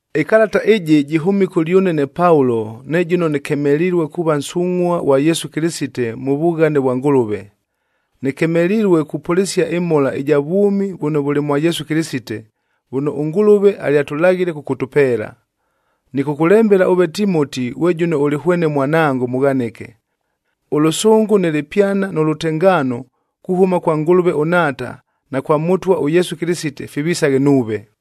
Ɨkalata ɨjɨ jɨhʉmile kʉlyʉne ne Paulo ne jʉno nɨkemelilue kuuva nsungʼhua ghwa Yesu Kɨlɨsite mʉ vughane vwa Ngʉlʉve. Nɨkemelilue kupʉlɨsia ɨmhola ɨja vwʉmi vʉno vʉlɨ mwa Yesu Kɨlɨsite, vʉno ʉNgʉlʉve alyalaghile kʉkʉtʉpeela. Nɨkʉkʉlembela ʉve Timoti ghwe jʉno ʉlɨ hwene mwanango mʉghanɨke. Ʉlʉsʉngʉ nɨ lɨpyana nʉ lʉtengaano, kuhʉma kwa Ngʉlʉve ʉNhaata na kwa Mʉtwa ʉYesu Kɨlɨsite fivisaghe nuuve.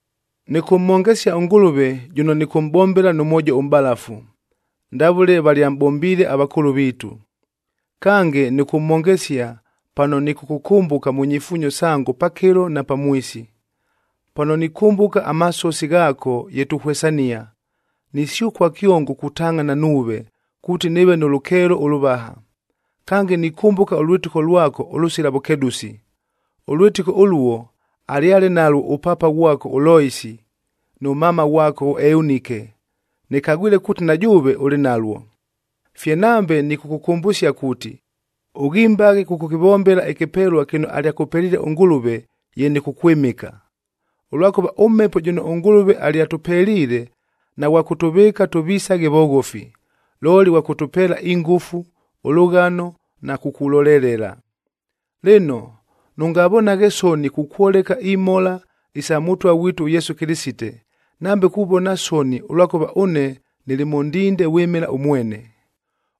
Nɨkʉmhongesia ʉNgʉlʉve jʉno nɨkʉmʼbombela nʉ mwojo ʉmʼbalafu, ndavʉle valyamʼbombiile avakʉʉlʉ viitu. Kange, nɨkʉmhongesia pano nɨkʉkʉkʉmbʉka mʉ nyifuunyo sango pakɨlo na pamwisi. Pano nikʉmbʉka amasosi ghaako ye tuhwesania, nisyʉkua kyongo kutangʼhana nuuve, kuuti nɨɨve nʉ lʉkeelo ʉlʉvaha. Kange, nikʉmbʉka ʉlwɨtɨko lwako ʉlʉsila vʉkedʉsi. Ʉlwɨtɨko ʉluo, alyale nalwo ʉpaapa ghwako ʉLoisi nʉ mama ghwako ʉEunike, nɨkagwile kuuti na jʉʉve ʉlɨ nalwo. Fye nambe nɨkʉkʉkʉmbʉsia kuuti, ʉghimbaghe kʉkʉkɨvombela ɨkɨpelua kɨno alyakʉpeliile ʉNgʉlʉve ye nɨkʉkwɨmɨka. Ʉlwakʉva ʉMhepo jʉno ʉNgʉlʉve alyatʉpeliile naghwa kʉtʉvɨɨka tʉvisaghe voghofi, looli ghwa kʉtʉpeela ingʉfu, ʉlʉghano na kukulolelela. Lɨno, nʉngavonaghe soni kukwoleka imhola isa Mʉtwa ghwitu ʉYesu Kɨlɨsite, nambe kuvona soni ʉlwakʉva ʉne nɨlɨ mʉ ndinde vwɨmɨla ʉmwene.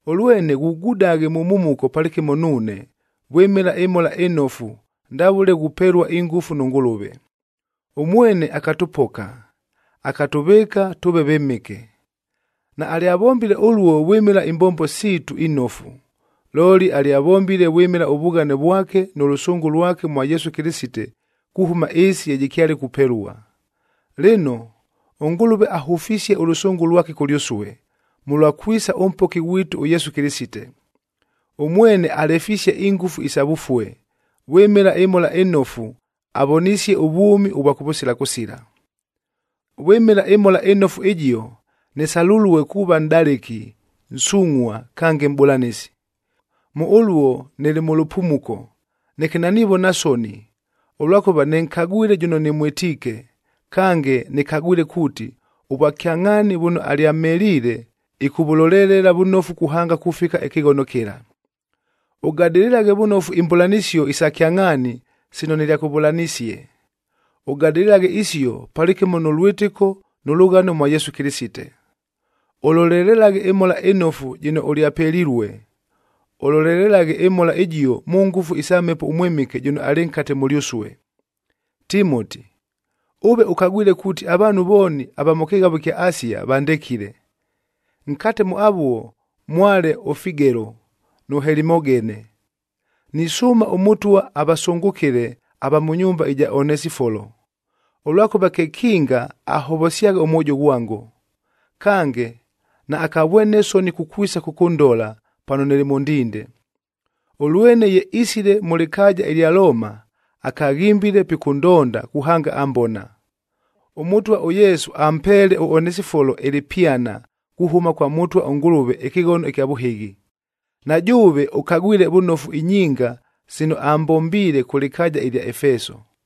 Ʉlwene ghugudaghe mʉ mhumuko palɨkɨmo nuune, vwɨmɨla ɨMhola ɨNofu ndavʉle ghupelua ingʉfu nʉ Ngʉlʉve. Ʉmwene akatʉpoka, akatʉvɨɨka tʉʉve vɨmɨke. Naalyavombile ʉluo vwɨmɨla imbombo siitu inofu, looli alyavombile vwɨmɨla ʉvughane vwake nʉ lʉsʉngʉ lwake mwa Yesu Kɨlɨsite kuhʉma ɨɨsi ye jɨkyale kupelua. Lɨno, ʉNgʉlʉve ahʉfisie ʉlʉsʉngʉ lwake kʉlyʉsue, mʉlwa kwisa ʉMpoki ghwitu ʉYesu Kɨlɨsite. Ʉmwene alefisie ingʉfu isa vʉfue, vwɨmɨla ɨMhola ɨNofu avonisie ʉvwʉmi ʉvwa kʉvʉsila kʉsila. Vwɨmɨla ɨMhola ɨNofu ɨjio, nɨsalulue kuuva nʼdalɨki, nsungʼhua, kange mʼbʉlanɨsi. Mʉ ʉluo nɨlɨ mʉ lʉpumuko, neke nanivona soni, ʉlwakʉva nɨnkagwile jʉno nɨmwɨtiike, kange nɨkagwile kuuti, ʉvwakyangʼhaani vʉno alyamheliile,a ɨkʉvʉlolelela vʉnofu kuhanga kufika ɨkɨghono kɨla. Ʉgadɨlɨlaghe vʉnofu imbʉlanɨsio isa kyangʼhaani sino nɨlyakʉvʉlanisie. Ʉgadɨlɨlaghe isio palɨkɨmo nʉ lwɨtɨko nʉ lʉghano mwa Yesu Kɨlɨsite. Ʉlolelelaghe ɨmhola ɨnofu jɨno ʉlyapelilue. Ʉlolelelaghe ɨmhola ɨjio mʉ ngʉfu isa Mhepo ʉMwɨmɨke jʉno alɨ nkate mʉlyʉsue. Timoti, ʉve ʉkagwile kuuti avaanhu vooni ava mʉ kɨghavob ɨkya Asia vandekile. Nkate mʉ avuo mwale ʉFigelo nʉ Helimogene. Nisʉʉma ʉMʉtwa avasʉngʉkɨle ava mʉ nyumba ɨja Onesifolo, ʉlwakʉva kekinga ahovosyagha ʉmwojo ghwango. Kange, naakavwene soni kukwisa kʉkʉndola, pano nɨlɨ mʉ ndinde. Ʉlwene ye isile mʉ lɨkaaja ɨlya Looma, akaghimbile pikʉndonda kuhanga ambona. ɄMʉtwa ʉYesu ampeele ʉOnesifolo ɨlɨpyana, kuhʉma kwa Mʉtwa ʉNgʉlʉve ɨkɨghono ɨkya vʉhɨghi. Na jʉʉve ʉkagwile vʉnofu inyinga sino ambombiile kʉ lɨkaaja ɨlya Efeso.